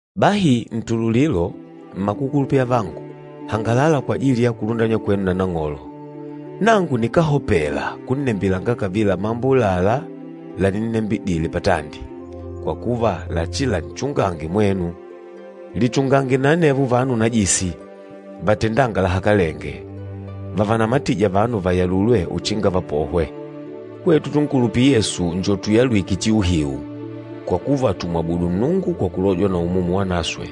Bahi ntululilo, mmakukulupila avangu, hangalala kwajili ya kulundanywa kwenu na Nang'olo. Nangu nikáhopela kunnembilanga kavila mambo ùlalá laninnembidile patandi, kwa kuva lachilanchungange mwenu. Lichungange na anevo vanu najisi, vatendânga lahakalenge, vavanamatîja vanu vayalulwe uchinga vapohwe. Hwetu tunkulupîla Yesu nni tuyalwîke chiuhiu, kwa kuva tùmwabudu Nnungu kwa kulojwa na Umumu Wanaswe,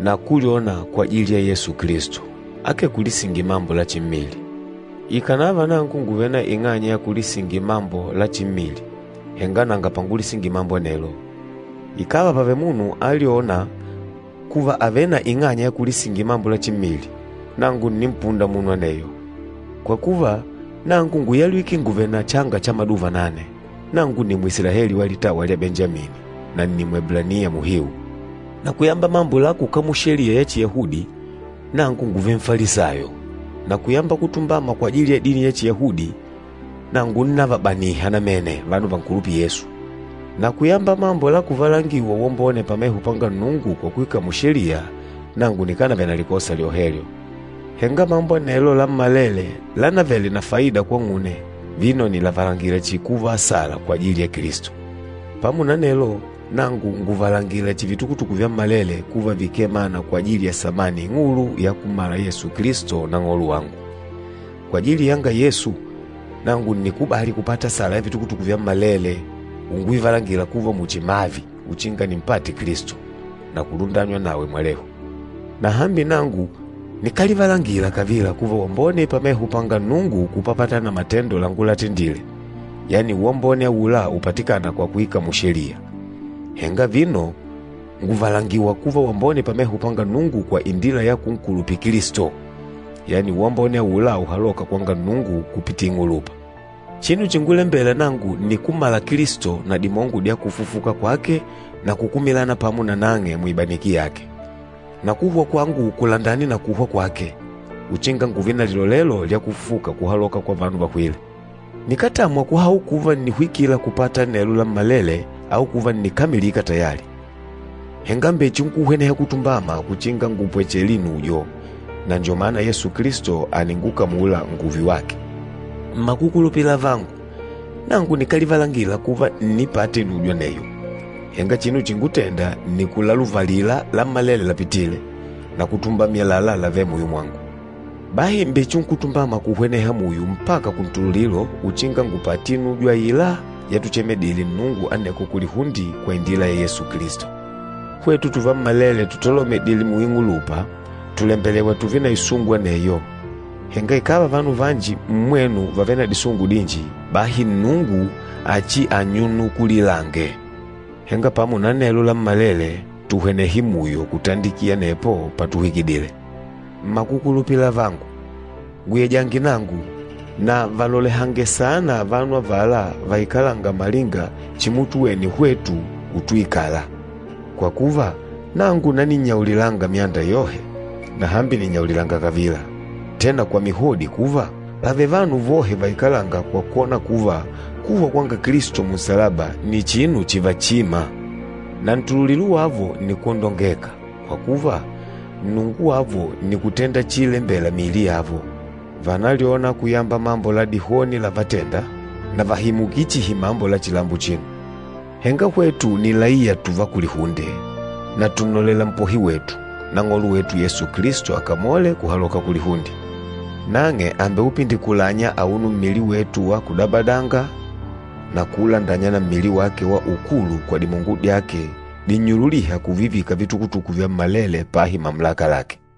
na kulyona kwajili ya Yesu Kilisto, akee kulisingila mambo la chimmili. Ikànava nangu ngùvele na ing'anya ya kulisingila mambo la chimmili, henga nanga pangulisingila mambo anelo. Ikàva pàvele munu àlyona kuva àvele na ing'anya ya kulisingila mambo la chimmili, nangu ǹnimpunda munu aneyo. Kwa kuva, nangu ngúyalwike nguvèlè na changa cha maduva nane. Nangu nni Mwisilaeli wa litawa lwa Benjamini, na nni Mweblaniya muhiu. Na kuyamba mambo la kukamula Sheliya ya Chiyahudi, nangu ngúvele Nfalisayo, na kuyamba kutumbama kwajili ya dini ya Chiyahudi, nangu ńnavabaniha namene vanu vankulupîla Yesu. Na kuyamba mambo la kuvalangiwa uwambone pameho panga Nnungu kwa kuikamula Sheliya, nangu nikánavele na likosa lyohelyo. Henga mambo anelo lammalele lánavele na faida kwang'une, vino nìlavalangila chihi kuva asala kwajili ya Kilisto. Pamo na anelo, nangu ngùvalangila chihi vitukutuku vyammalele kuva vikee mana kwajili ya samani ing'ulu ya kummala Yesu Kilisto Nang'olo wangu. Kwajili yanga Yesu, nangu ǹnikubali kupata asala ya vitukutuku vyammalele, unguvivalangila kuva muchi mavi uchinga nimpate Kilisto, na kulundanywa nawe mwalehu. Na hambi nangu nikálivalangila kavila kuva wambone pameho panga Nnungu kupapatana na matendo langulatendile, yani uwambone aula upatikâna kwa kuikamula Sheliya. Henga vino ngùvalangiwa kuva wambone pameho panga Nnungu kwa indila ya kunkulupila Kilisto, yani uwambone aula uhalôka kwanga Nnungu kupitila ing'ulupa. Chinu chingulembela nangu nni kummala Kilisto na dimongo dya kufufuka kwake na kukumilana pamo nanang'e muibaniki yake, na kuhwa kwangu kulandane na kuhwa kwake, uchinga ngùùve na lilolelo lya kufufuka kuhaloka kwa vanu vahwîle. Nikátamwa kuhaula kuva ǹnihwikila kupata anelo lammalele au kuva ǹnikamilika tayali. Henga mbechinkuhweneha kutumbama uchinga ngupwechele inujo, na njo mana Yesu Kilisto àningukamula ngùùve wake. Mmakukulupila avangu, nangu nikálivalangila kuva ǹnipata inujo aneyo, henga chinu chíngutèndà nni kulaluvalila lammalele lapitîle, na kutumbamila àlalá lavêle muyo mwangu. Bahi mbechinkutumbama kuhwena muyo mpaka kuntululilo uchinga ngupate inujo aila yatuchemeledile Nnungu aneko kulihunde kwa indila ya Yesu Kilisto. Hwetu tuvammalele tutolomedîle muing'ulupa, tùlembelewa tùùve na isungu aneyo. Henga ikàva vanu vanji mmwenu vàvele na disungu dinji, bahi Nnungu achiannyunukulilange. Henga pamo na anelo lammalele, tuhwenehe muyo kutandikila anepo patuhwikidile. Mmakukulupila avangu, nguyejange nangu, na valolehange saana vanu avala vaikalânga malinga chimutuwene hwetu utuikala. Kwa kuva, nangu naninnyaulilanga myanda yohe, na hambi ninnyaulilanga kavila, tena kwa mihodi kuva, pàvele vanu vohe vaikalânga kwa kwona kuva, kuhwa kwanga Kilisto munsalaba nni chinu chakuchimwa. Na ntululilo wavo ni kwondongeka, kwa kuva, nnungu wavo nni kutenda chiilembela miili yavo, vànalyona kuyamba mambo la dihoni lávatèndà, na vàhimukila chihi mambo la chilambo achino. Henga hwetu ni laiya tùvá kulihunde, na tùnnolela Mpohi wetu, Nang'olo wetu Yesu Kilisto akamole kuhaloka kulihunde. Nang'e àmbeupindikulanya auno mmili wetu wa kudabadanga na kuulandanya na mmili wake wa ukulu kwa dimongo dyake dinnyululîha kuvivika vitukutuku vyammalele pahi mamulaka lake.